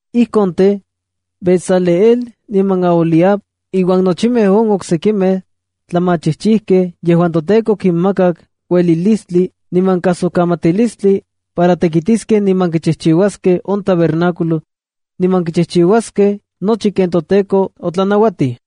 ’Ijkon tej, Bezaleel niman Aholiab iuan nochimej on oksekimej tlamachijchijkej yejuan toTEKO okinmakak uelilistli niman kajsikamatilistli para tekitiskej niman kichijchiuaskej on tabernáculo niman kichijchiuaskej nochi ken toTEKO otlanauatij.”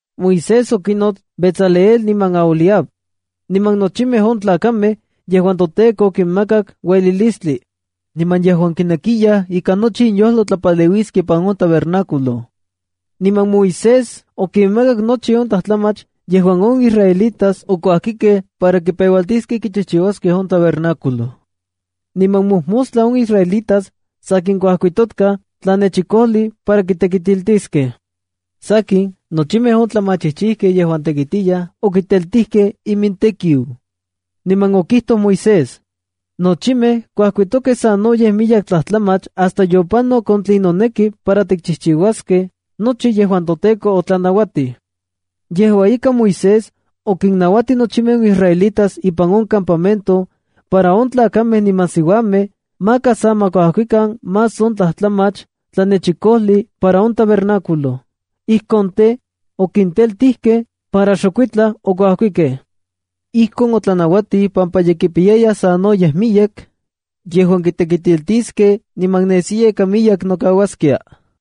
Moisés okinnots Bezaleel niman Aholiab, niman nochimej on tlakamej yejuan toTEKO okinmakak uelilistli niman yejuan kinekiyaj ika nochi inyojlo tlapaleuiskej ipan on tabernáculo. Niman Moisés okinmakak nochi on tlajtlamach yejuan on israelitas okuajkikej para kipeualtiskej kichijchiuaskej on tabernáculo. Niman mojmostla on israelitas sanken kuajkitikatkaj tlanechikojli para kitekitiltiskej. Sakin, nochimej on tlamachijchijkej yejuan tekitiyaj, okiteltijkej imintekiu, niman okijlitoj Moisés: “Nochimej kuajkitokej sanoyej miyek tlajtlamach hasta yopanok on tlen noneki para tikchijchiuaskej nochi yejuan toTEKO otlanauatij.” Yejua ika, Moisés okinnauatij nochimej on israelitas ipan on campamento, para on tlakamej niman siuamej maka sa ma kuajkikan más on tlajtlamach tlanechikojli para on tabernáculo. Ijkon tej, okinteltijkej para xokuitlaj okuajkikej. Ijkon otlanauatij pampa ye kipiyayaj sanoyej miyek yejuan kitekitiltiskej niman nesiya ika miyek nokauaskia.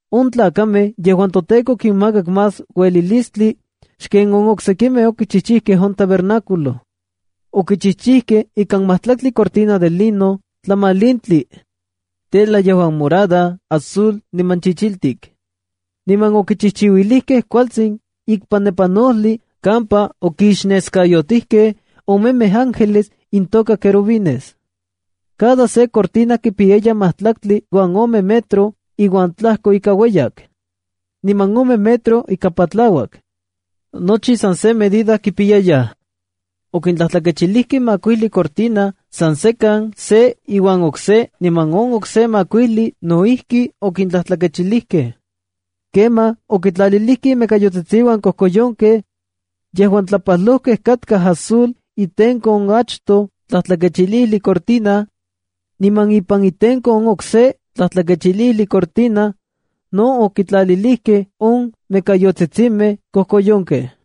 On tlakamej yejuan toTEKO okinmakak más uelilistli xken on oksekimej okichijchijkej on tabernáculo. Okichijchijkej ikan majtlaktli cortina de lino tlamalintli, tela yejuan morada, azul, niman chichiltik. Niman okichijchiuilijkej kualtsin ikpanepanojli kampa okixneskayotijkej omemej ángeles intoka querubines. Cada se cortina kipiyaya majtlaktli uan ome metro uan tlajko ika ueyak, niman ome metro ika patlauak. Nochi san se medida kipiyayaj. Okintlajtlakechilijkej makuijli cortina san sekan se iuan okse niman on okse makuijli no ijki okintlajtlakechilijkej. Kemaj okitlalilijkej imekayotsitsiuan kojkoyonkej, yejuan tlapajlojkej katkaj azul itenko on achtoj tlajtlakechilijli cortina, niman ipan itenko on okse tlajtlakechilijli cortina, no okintlalilijkej on mekayotsitsimej kojkoyonkej.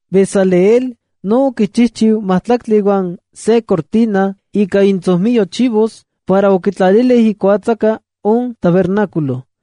Bezaleel no okichijchiu majtlaktli uan se cortina ika intsojmiyo chivos para okitlalilijkej ikuatsaka on tabernáculo.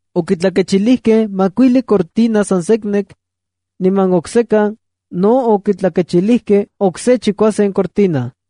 Okitlakechilijkej makuijli cortina san seknek, niman oksekan no okitlakechilijkej okse chikuasen cortina.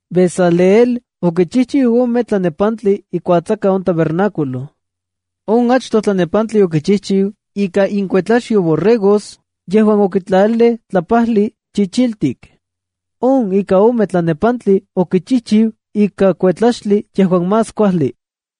Bezaleel okichijchiu ome tlanepantli ikuatsaka on tabernáculo. On achtoj tlanepantli okichijchiu ika inkuetlaxyo borregos yejuan okitlalilij tlapajli chichiltik. On ika ome tlanepantli okichijchiu ika kuetlaxtli yejuan más kuajli.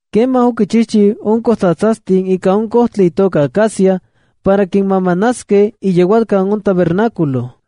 Kemaj okinchijchiu on kojtsatsastin ika on kojtli itoka acacia para kinmamanaskej iyeualkan on tabernáculo.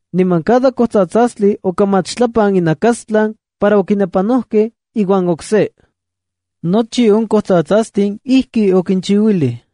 Niman cada kojtsatsastli okamachtlapan inajnakastlan para okinepanojkej iuan okse. Nochi on kojtsatsastin ijki okinchiuilij.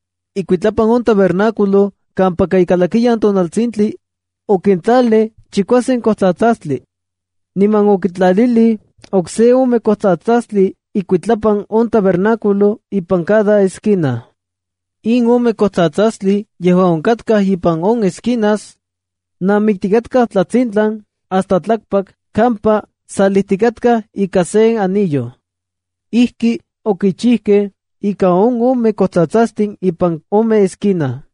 Ikuitlapan on tabernáculo kampaka ikalakiyan tonaltsintli, okitlalij chikuasen kojtsatsastli. Niman okitlalij okse ome kojtsatsastli ikuitlapan on tabernáculo ipan cada esquina. In ome kojtsatsastli yejuan onkatkaj ipan on esquinas, namiktikatkaj tlatsintlan hasta tlakpak kampa salijtikatkaj ika sen anillo. Ijki okichijkej ika on ome kojtsatsastin ipan on ome esquina.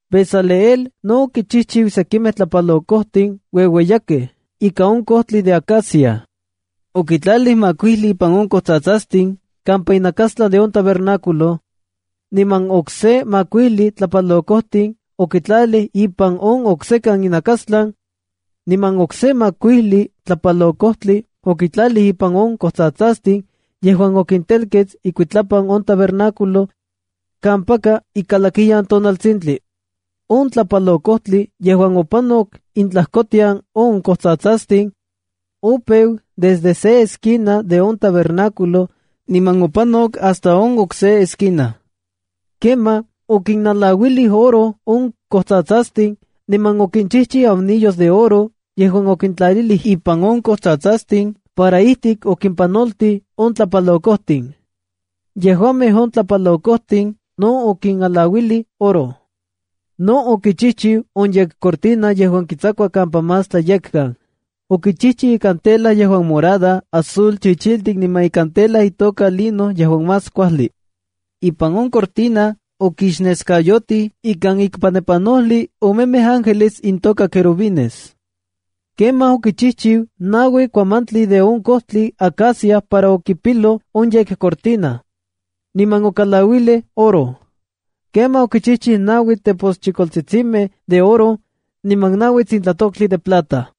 Bezaleel no okichijchiu sekimej tlapalokojtin ueueyakej ika on kojtli de acacia. Okitlalij makuijli ipan on kojtsatsastin kampa inakastlan on tabernáculo, niman okse makuijli tlapalokojtli okitlalij ipan on oksekan inakastlan, niman okse makuijli tlapalokojtli okitlalij ipan on kojtsatsastin yejuan okintelkets ikuitlapan on tabernáculo, kampaka ikalakiyan tonaltsintli. On tlapalokojtli yejuan opanok intlajkotian on kojtsatsastin, opeu desde se esquina de on tabernáculo niman opanok hasta on okse esquina. Kemaj okinalauilij oro on kojtsatsastin, niman okinchijchiu anillos de oro yejuan okintlalij ipan on kojtsatsastin para ijtik okimpanoltij on tlapalokojtin. Yejuamej on tlapalokojtin no okinalauilij oro. No okichijchiu on yekcortina yejuan kitsakua kampa más tlayekkan. Okichijchiu ikan tela yejuan morada, azul, chichiltik niman ikan tela itoka lino yejuan más kuajli. Ipan on yekcortina okixneskayotij ikan ikpanepanojli omemej ángeles intoka querubines. Kemaj okichijchiu naui kuamantli de on kojtli acacia para okipiloj on yekcortina, niman okalauilij oro. Kemaj okichijchiu naui teposchijkoltsitsimej de oro, niman naui tsintlatoktli de plata.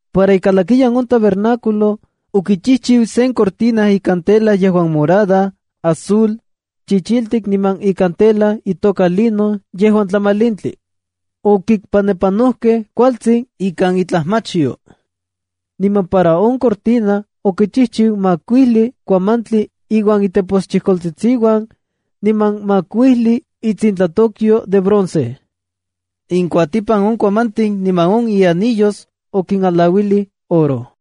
Para ikalakiyan on tabernáculo, okichijchiu sen cortina ika tela yejuan morada, azul, chichiltik niman ikan tela itoka lino yejuan tlamalintli. Okikpanepanojkej kualtsin ikan itlajmachyo. Niman para on cortina, okichijchiu makuijli kuamantli iuan iteposchijkoltsitsiuan, niman makuijli itsintlatokyo de bronce. Inkuatipan on kuamantin niman on ianillos, okinalauilij oro.